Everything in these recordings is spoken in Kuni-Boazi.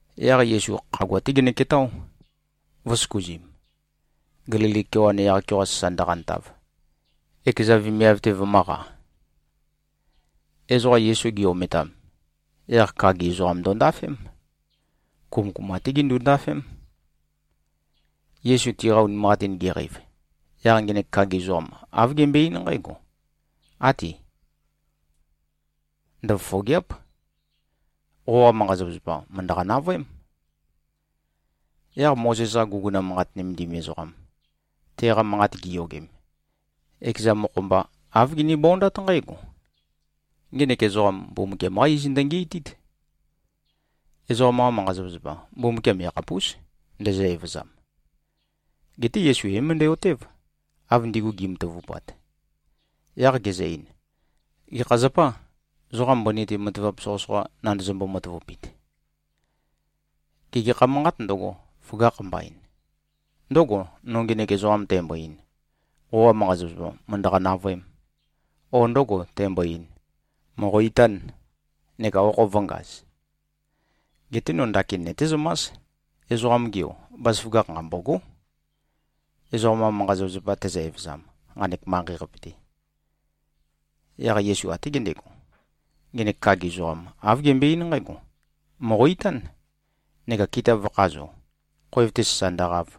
Yaq Yesu khagua-té genøketáo, vø̄søkuzim, Gelili kewan yaq-keoqa sasa ndøqantav, ekeza vemiav-te vømø̄qa. Ezoqa Yesu gi-ometam, yaq kagi ezoqam ndondafém. Kumøkuma-té gindu-ndafém. Yesu tiqa unimanqatin geqeiv, yaq ngenek kagi ezoqam, āv gembøe-eín nqǽgo, “Áti. Ndøfofògea᷄p. Qoqa manqa-zapazapa mø̀ndøqa-navøém.” Yaq Mozes-qa guguna manqat nømendim ezoqam, teqa manqat giyogem, ekeza mokho-mba āv ginibondát nqǽgo, “Ngenek ezoqam, Mbumbukiam-qá iz ndøngi꞉tít. Ezoqam-qa manqa-zapazapa, Mbumbukiam yakhapús, ndezø-evøzam.” Geté Yesu é-møndæ-otév, av ndigu gi꞉matavupat. Yaq gezø-ein, “Gekha zapâ, zoqa mbøni-te matavap soqøsoqa nandozombo-matavupit? Gê, gekha manqât ndøgo, føgakh mbain? Ndǿgò, no ngenek ezoqam tæmbo-ein, ‘Qoqa manqa-zapazapa mø̀ndøqa-navøēm,’ o ndǿgò, tæmbo-ein, ‘Mòqo-itán, neka okho vø̄ngaz’? Geté no ndakin nøtézømás, Ezoqam-ge Yo, bazaføgakh nqambôgó, ezoqam-qa manqa-zapazapa tezø-evøzam, nqanek manqei-qape-te.” Yaq Yesu até gendego, ngenek kagi ezoqam, āv gembøe-eín nqǽgo, “Mòqo-itán, neka kita vø̄khazo, khoev-te sasa ndøqav.”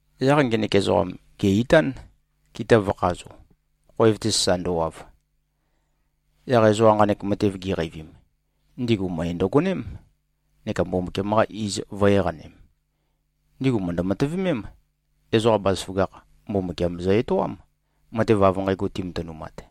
Yaq ngenek ezoqam, gè-itán, kita vø̄khazo, khoev-te sasa ndøwav. Yaq ezoqa nqanek matev giqeivim, ndigu møe ndøgoném neka Mbumbukiam-qa iz vø̄-eqanem. Ndigu mø̀ndø-matøvemém, ezoqa bazaføgakh Mbumbukiam zø-etoám, matev av nqægo timatønumat.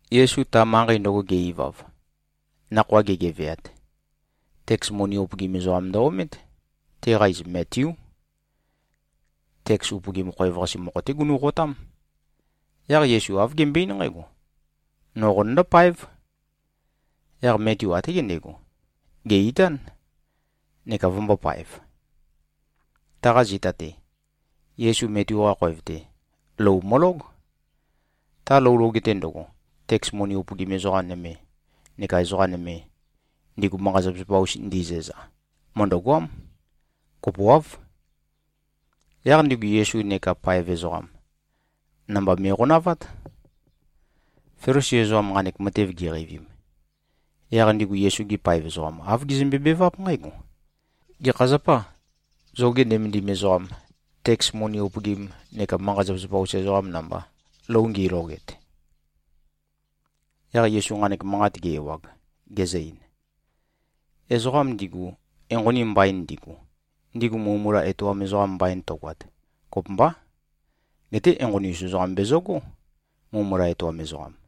Yesu ta manqei ndøgo ge-ivav, nakhoa gegeveat, teks moni upøgim ezoqam ndø-omét. Teqa iz Metiú. Teks upøgim khoev-qase mokho-té gunu꞉qotám. Yaq Yesu āv gembøe-eín nqǽgo, “No qonøndó-páev.” Yaq Metiu até gendego, gè-itán, neka vømbōpaev. Taqa zita-te, Yesu Metiu-qa khoev-te, lou mølóg. Ta lou loge-te ndøgo, teks moni upøgim ezoqa nøme neka ezoqa nøme, ndigu manqa-zapazapa-us ndizæza, mø̀ndøgoám. Kopoáv. Yaq ndigu Yesu neka paev ezoqam, namba me꞉qonavát. Felisi ezoqam nqanek matev giqeivim, yaq ndigu Yesu-gi paev ezoqam, āv gizømbe-beváp nqǽgo, “Gekha zapâ, zoge nømendim ezoqam, teks moni upøgim neka manqa-zapazapa-us ezoqam namba, lou ngiloget?” Yaq Yesu nqanek manqat ge-ewag, gezø-ein, “Ezoqam ndigu enqoni mbain ndigu, ndigu mulømula etoam ezoqam mbain tøgoat, kopømbá. Geté enqoni-us ezoqam bezøgó, mulømula etoam ezoqam.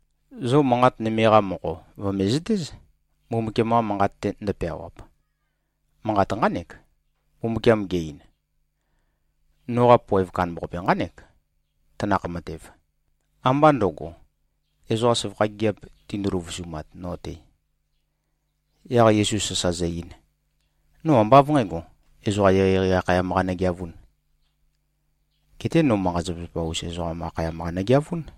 Zo manqat nøme-qa mokho vø̀mezøtéz, Mbumbukiam-qa Manqat-te ndøpeawap. Manqat nqánek, ‘Mbumbukiam ge-ein: Noqa poev kandambaqape nqánek, tanakh matev. Ambá ndøgo, ezoqa søvakha gigiap tindu-løvusumat no-te.’” Yaq Yesu sasa zø-ein, “No ambá av nqǣgo, ezoqa eqeieqei akhayam-qa nøgeavūn. Geté no manqa-zapazapa-us ezoqam akhayam-qa nøgeavún.”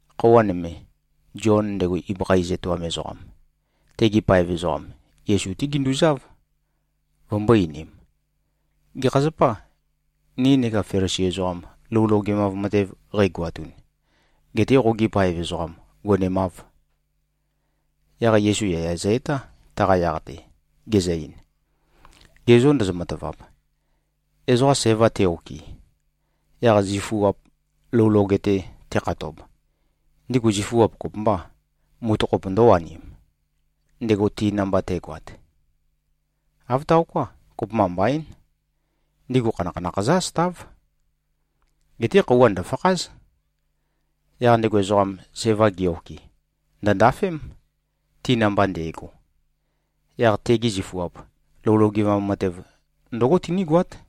Khøuwa nøme, Zion, ndego ibøkha iz etoam ezoqam, tegi paev ezoqam, Yesu-té ginduzáv, vømbō-einim, “Gekha zapâ, ni neka Felisi ezoqam lou logemav matev qeigoatun, getē qogi paev ezoqam gonemāv?” Yaq Yesu yaya zø-etá, taqa yaq-te, gezø-ein, “Ge zô ndozo-matavap, ezoqa sæva te-okɨ, yaq zifuap lou loge-te tekhatob, ndigu zifuap kopømbâ, mutøkhop ndø̄wanim, ndego ti namba te꞉goat? Āv taoká. Kopømba mbaín. Ndigu khanakhanakh zǿ-asøtáv. Geté khøuwa ndø̀fakház. Yaq ndego ezoqam, sævam ge-okɨ, ndø̀ndafém, ti namba nde꞉go. Yaq tegi zifuap lou logemav matev, ndǿgo tinígoát.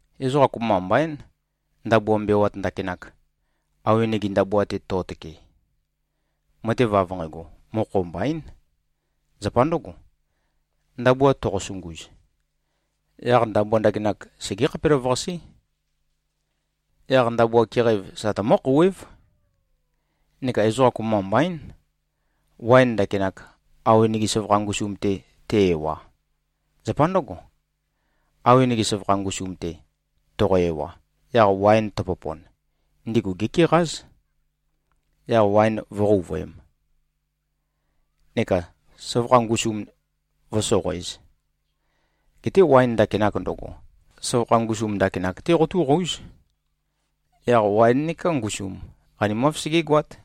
Ezoqa kopømba mbaín, ndabua mbewat ndakinak, awenege ndabua-te to꞉tøke. Matev av nqægo, mokho mbaín. Zapa ndǿgo, ndabua toqosunguz, yaq ndabua ndakinak segé-khapelavøqasé. Yaq ndabua keqæv sa tømǿ-khouwév. Neka ezoqa kopømba mbaín, waen ndakinak, awenege søvakha ngusum-te te-ewa. Zapa ndǿgo, awenege søvakha ngusum-te toqo-ewa, yaq waen tøpopon, ndigu gékeqáz. Yaq waen vǿqouvøēm, neka søvakha ngusum vǿsoqoēz. Geté waen ndakinak ndøgo, søvakha ngusum ndakinak-té qotúqóuz. Yaq waen neká ngusum, qanimáv, segégoát.”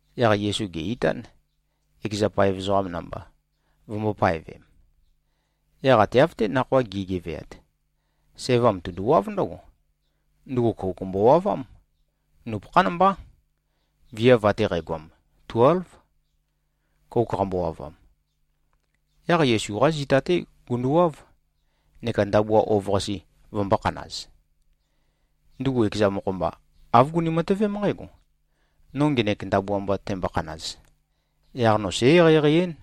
Yaq Yesu gè-itán, ekeza paev ezoqam namba, vømbō-paevem. Yaq ate av-té nakhoa gi꞉geveat, sævam tunduwáv ndǿgo. Ndugu kouk mbowavám. Nupøkhán mbá. Viav ate qægoam tuélv, kouk qambowavam. Yaq Yesu-qá zita-té gunduwáv, neka ndabua ov-qase vømbō-khanaz. Ndugu ekeza mokho-mba āv guni-matøvém nqǽgo, “No ngenek ndabua mba tæmbokhanaz, yaq no sǽ-eqeieqei-én.”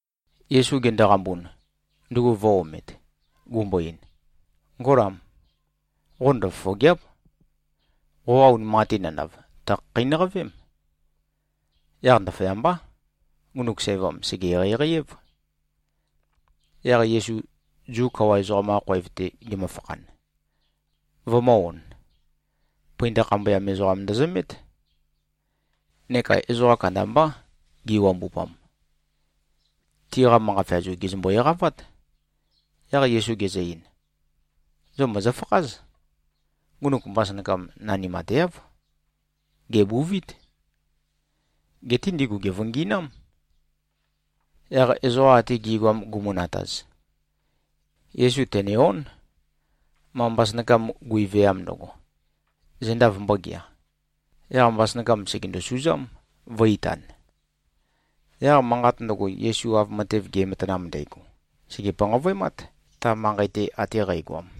Yesu gendoqambun, ndugu vø̄-omet, gumbo-ein, “Ngólam. Qo ndøfofògea᷄p. Qoqa unimanqatin nandav, tø̀khakheinøqavém.” Yaq ndaføyambá, ngunuk sævam, sège-eqeieqei-év. Yaq Yesu Zu kawa ezoqam-qa khoev-te gemøfakhan, vømø̄-on, pøinda khambøyam ezoqam ndøzømét. Neka ezoqa kandambá giwambupam. Tiqa manqa feazu gèzømbo-eqavát. Yaq Yesu gezø-ein, “Zo mòzofakház. Ngunuk mbasønakam nanimateáv. Gèbuvít.” Geté ndigu gèvøngi꞉nám. Yaq ezoqa ate gi꞉goam gumu-nataz, Yesu tène-ón, ma mbasønakam gui-veam ndøgo, zenda vømbōgea. Yaq mbasønakam, sègendo-suzám, vø̄-itan. Yaq manqat ndøgo, Yesu av matev ge꞉matanam ndægo, sège-panqavøemát, ta manqei-te ate qægoam.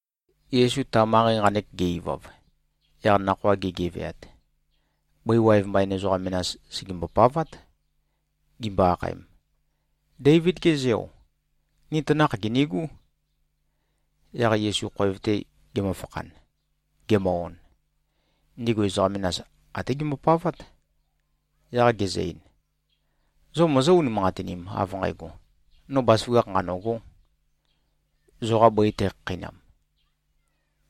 Yesu ta manqei nqanek ge-ivav, yaq nakhoa ge꞉geveat, bøi waev mbain ezoqa menas, sègembo-pavát, gimbo-akhaem, “Déivid-ge Zeo. Ni tanakh gìnigú.” Yaq Yesu khoev-te gemøfakhan, gemø-on, ndigu ezoqa menas até gembopavát. Yaq gezø-ein, “Zo mozó-unimanqatinim, av nqægo, no bazaføgakh nqanø̂gō, zoqa bøi tækhakheinam?”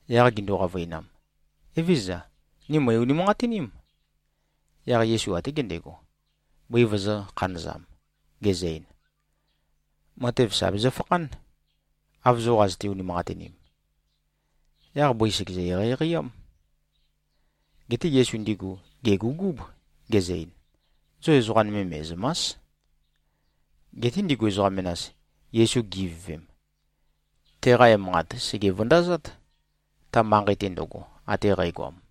Yaq gindu-qavøinam, “Evézøza. Ni mø̀i-unimanqatiním.” Yaq Yesu até gendego, bøi vøzø̄-khanøzam, gezø-ein, “Matev sà bezøfakhán, av zo qazøte-unimanqatinim.” Yaq bøi sègezø-eqeieqei-ám. Geté Yesu ndigu gègugúb, gezø-ein, “Zo ezoqa nøme me꞉zø̀ma᷄s!” Geté ndigu ezoqa menas Yesu gi-ivøvem, teqa emanqat sège-vøndazát, ta manqei-te ndøgo, ate qægoam.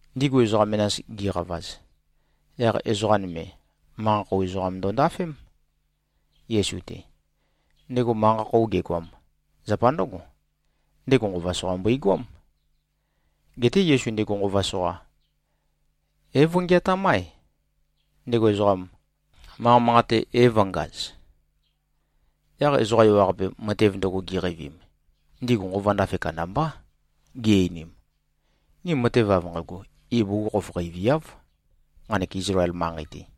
Ndigu ezoqa menas gi꞉qavaz, yaq ezoqa nøme, manqa-khou ezoqam ndondafém, Yesu-te. Ndego manqa-khou gegoam, zapa ndǿgo: Ndego nqova soqa mbøigoám. Geté Yesu ndego nqova soqa é-vøngeatám-ae, ndego ezoqam, manqa manqate é-vø̄ngaz. Yaq ezoqa ewaqape, matev ndøgo giqeivim, ndigu nqova ndafe kandambá. Gi-einim, “Ni matev av nqægo ibugukhokhof qeiviáv, nqanek Izlael manqei-te.”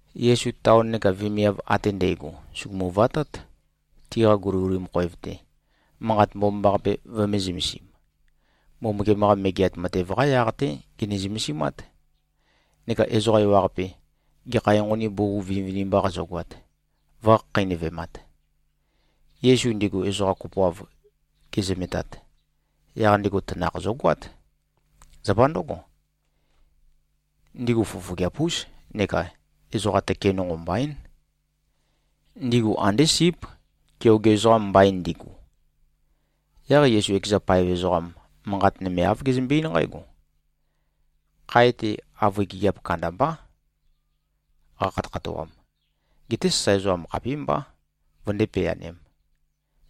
Yesu taon neka vemiav ate ndægo sùgumu-vatát, tiqa guliguli khoev-te, Manqat Mbomambaqape vømē-zømesim. Mbumbukiam-qa Megeat Matev-qá yaq-té gene-zømesimát. Neka ezoqa ewaqape, gekha enqoni bugug vinivinimba qazøgoat, vø̄khakheinøvemat. Yesu ndigu ezoqa kopoav gezømetat, yaq ndego tanakh zøgoát. Zapa ndǿgo, ndigu fofogeap-ús neka ezoqa tøke nonqo mbaín. Ndigu andé síp, keoge ezoqam mbain ndigu. Yaq Yesu ekeza paev ezoqam manqat nøme āv gezømbe-eín nqǽgo, “Khae-te avøe gigiap kandambá qakhatøkhatoam. Geté sasae ezoqam khapímbá, vøndé-peanēm.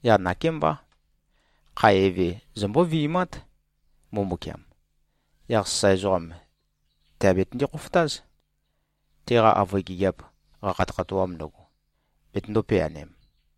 Yaq nakémbá. Khae eve, zombó-vi꞉mát, Mbumbukiam. Yaq sasae ezoqam tèabetønde-khofotáz, teqa avøe gigiap qakhatøkhatoam ndøgo, betøndō-peanem.”